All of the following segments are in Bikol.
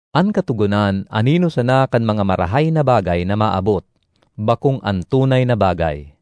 An Katogonan anino sana kan mga marahay na bagay na maabot, bakong an tunay na bagay.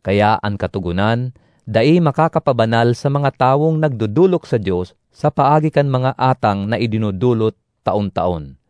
Kaya an Katogonan dai makakapabanal sa mga tawong nagdodolok sa Dios sa paagi kan mga atang na idinodolot taon-taon.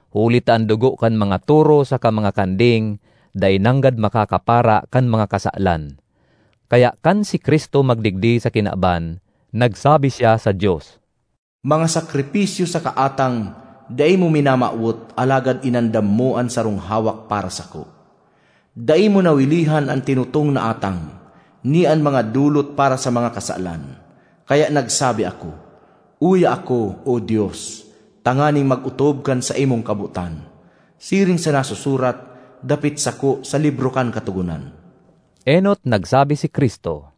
Huli ta an dugo kan mga toro saka mga kanding dai nanggad makakapara kan mga kasalan. Kaya kan si Cristo magdigdi sa kinaban, nagsabi siya sa Dios, “Mga sakripisyo saka atang dai mo minamawot alagad inandam mo an sarong hawak para sako. Dai mo nawilihan an tinutong na atang, ni an mga dolot para sa mga kasalan. Kaya nagsabi ako, ‘Uya ako, O Dios, tanganing mag-otob kan saimong kabotan, siring sa nasusurat dapit sako sa libro kan Katogonan.’” Enot nagsabi si Cristo,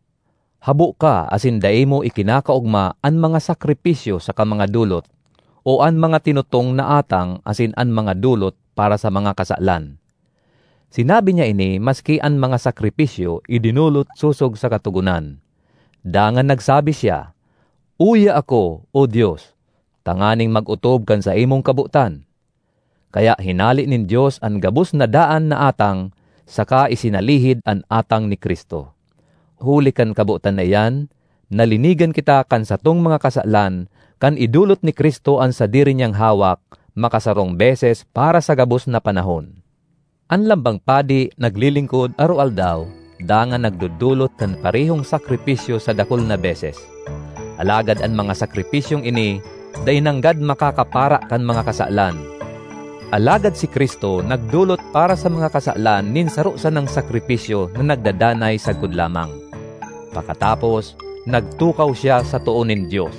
“Habo ka asin dai mo ikinakaogma an mga sakripisyo saka mga dolot, o an mga tinutong na atang asin an mga dolot para sa mga kasalan.” Sinabi niya ini maski an mga sakripisyo idinolot sosog sa Katogonan. Dangan nagsabi siya, “Uya ako, O Dios, tanganing mag-otob kan saimong kabotan.” Kaya hinale nin Dios an gabos na daan na atang saka isinalihid an atang ni Cristo. Huli kan kabotan na iyan, nalinigan kita kan satong mga kasalan kan idolot ni Cristo an sadiri niyang hawak makasarong beses para sa gabos na panahon. An lambang padi naglilingkod aroaldaw dangan nagdodolot kan parehong sakripisyo sa dakul na beses. Alagad an mga sakripisyong ini dai nanggad makakapara kan mga kasalan. Alagad si Cristo nagdolot para sa mga kasalan nin saro sanang sakripisyo na nagdadanay sagkod lamang. Pakatapos, nagtukaw siya sa too nin Dios.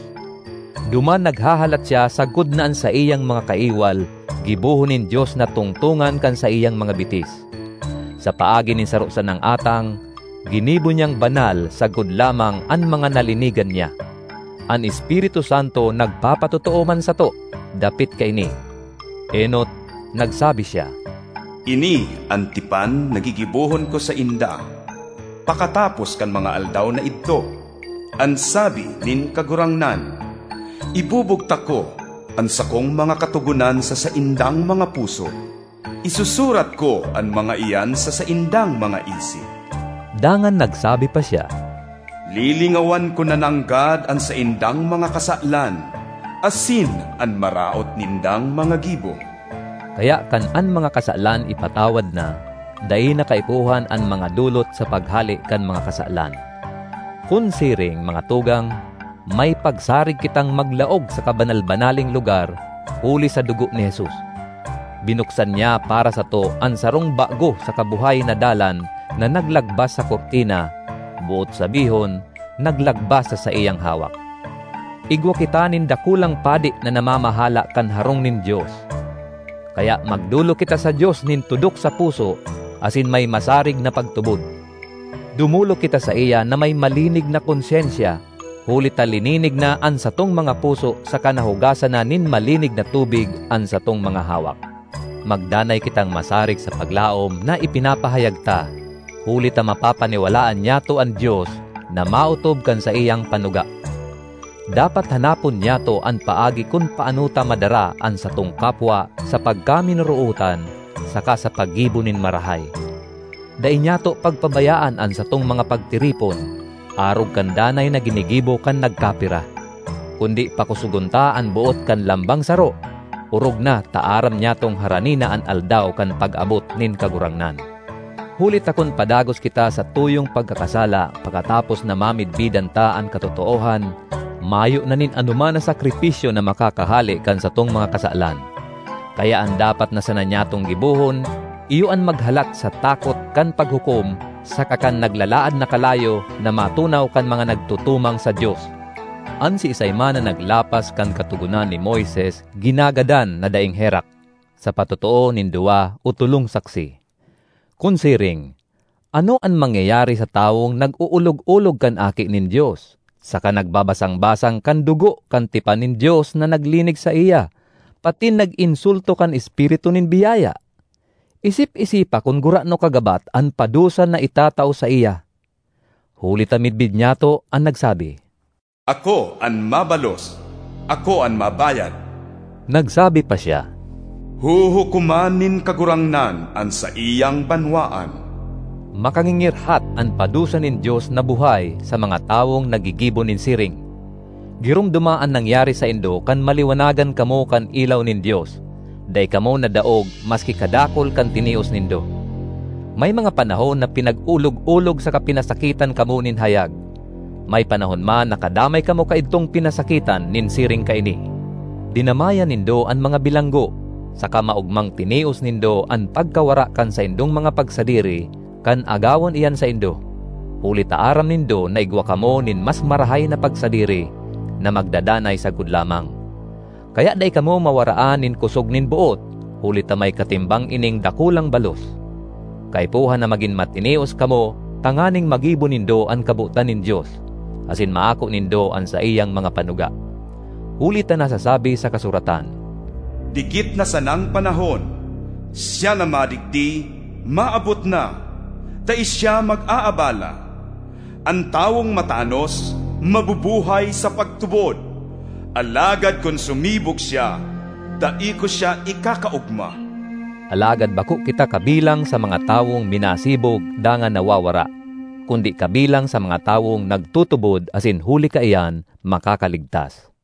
Duman naghahalat siya sagkod na an saiyang mga kaiwal gibohon nin Dios na tungtongan kan saiyang mga bitis. Sa paagi nin saro sanang atang, ginibo niyang banal sagkod lamang an mga nalinigan niya. An Espiritu Santo nagpapatotoo man sato dapit kaini. Enot, nagsabi siya, ”Ini an tipan na gigibohon ko sainda pakatapos kan mga aldaw na idto, an sabi nin Kagurangnan: Ibubugtak ko an sakong mga katogonan sa saindang mga puso, isusurat ko an mga iyan sa saindang mga isip.” Dangan nagsabi pa siya, “Lilingawan ko na nanggad an saindang mga kasalan asin an maraot nindang mga gibo.” Kaya kan an mga kasalan ipatawad na, dai na kaipuhan an mga dolot sa paghale kan mga kasalan. Kun siring, mga tugang, may pagsarig kitang maglaog sa Kabanal-banaleng Lugar huli sa dugo ni Jesus. Binuksan niya para sato an sarong bago saka buhay na dalan na naglagbas sa kurtina—boot sabihon, naglagbas sa saiyang hawak. Igwa kita nin dakulang padi na namamahala kan harong nin Dios. Kaya magdolok kita sa Dios nin tudok sa puso asin may masarig na pagtubod. Dumolok kita saiya na may malinig na konsyensya huli ta lininig na an satong mga puso saka nahugasan na nin malinig na tubig an satong mga hawak. Magdanay kitang masarig sa paglaom na ipinapahayag ta, huli ta mapapaniwalaan nyato an Dios na maotob kan saiyang panuga. Dapat hanapon nyato an paagi kun paano ta madara an satong kapwa sa pagkaminorootan saka sa paggibo nin marahay. Dai nyato pagpabayaan an satong mga pagtiripon, arog kan danay na ginigibo kan nagkapira. Kundi pakosogon ta an boot kan lambang saro, orog na ta aram nyatong harani na an Aldaw kan pag-abot nin Kagurangnan. Huli ta kun padagos kita sa tuyong pagkakasala pakatapos na mamidbidan ta an katotoohan, mayo na nin anoman na sakripisyo na makakahale kan satong mga kasalan. Kaya an dapat na sana nyatong gibohon iyo an maghalat sa takot kan paghukom saka kan naglalaad na kalayo na matunaw kan mga nagtutumang sa Dios! An siisay man na naglapas kan Katogonan ni Moises ginagadan na daing herak, sa patotoo nin duwa o tolong saksi. Kun siring, ano an mangyayari sa tawong nag-olog-olog kan Aki nin Dios, saka nagbasang-basang kan dugo kan tipan nin Dios na naglinig saiya, patin nag-insulto kan Espiritu nin biyaya? Isip-isipa kun gurano kagabat an padusa na itatao saiya! Huli ta midbid nyato an nagsabi, “Ako an mabalos, ako an mabayad.” Nagsabi pa siya, “Huhukoman nin Kagurangnan an saiyang banwaan.” Makangingirhat an padusa nin Dios na buhay sa mga tawong naggigibo nin siring! Giromdoma an nangyari saindo kan maliwanagan kamo kan ilaw nin Dios—dai kamo nadaog maski kadakul kan tinios nindo. May mga panahon na pinag-olog-olog saka pinasakitan kamo nin hayag; may panahon man na kadamay kamo kaidtong pinasakitan nin siring kaini. Dinamayan nindo an mga bilanggo, saka maogmang tinios nindo an pagkawara kan saindong mga pagsadiri kan agawon iyan saindo, huli ta aram nindo na igwa kamo nin mas marahay na pagsadiri, na magdadanay sagkod lamang. Kaya dai kamo mawaraan nin kosog nin boot huli ta may katimbang ining dakulang balos. Kaipuhan na magin matinios kamo tanganing magibo nindo an kabotan nin Dios; asin maako nindo an saiyang mga panuga. Huli ta nasasabi sa kasuratan, “Dikit na sanang panahon, siya na madigdi maabot na; dai siya mag-aabala. An tawong matanos, mabubuhay sa pagtubod; alagad kun sumibog siya, dai ko siya ikakaogma.” Alagad bako kita kabilang sa mga tawong minasibog dangan nawawara, kundi kabilang sa mga tawong nagtutubod asin huli kaiyan makakaligtas.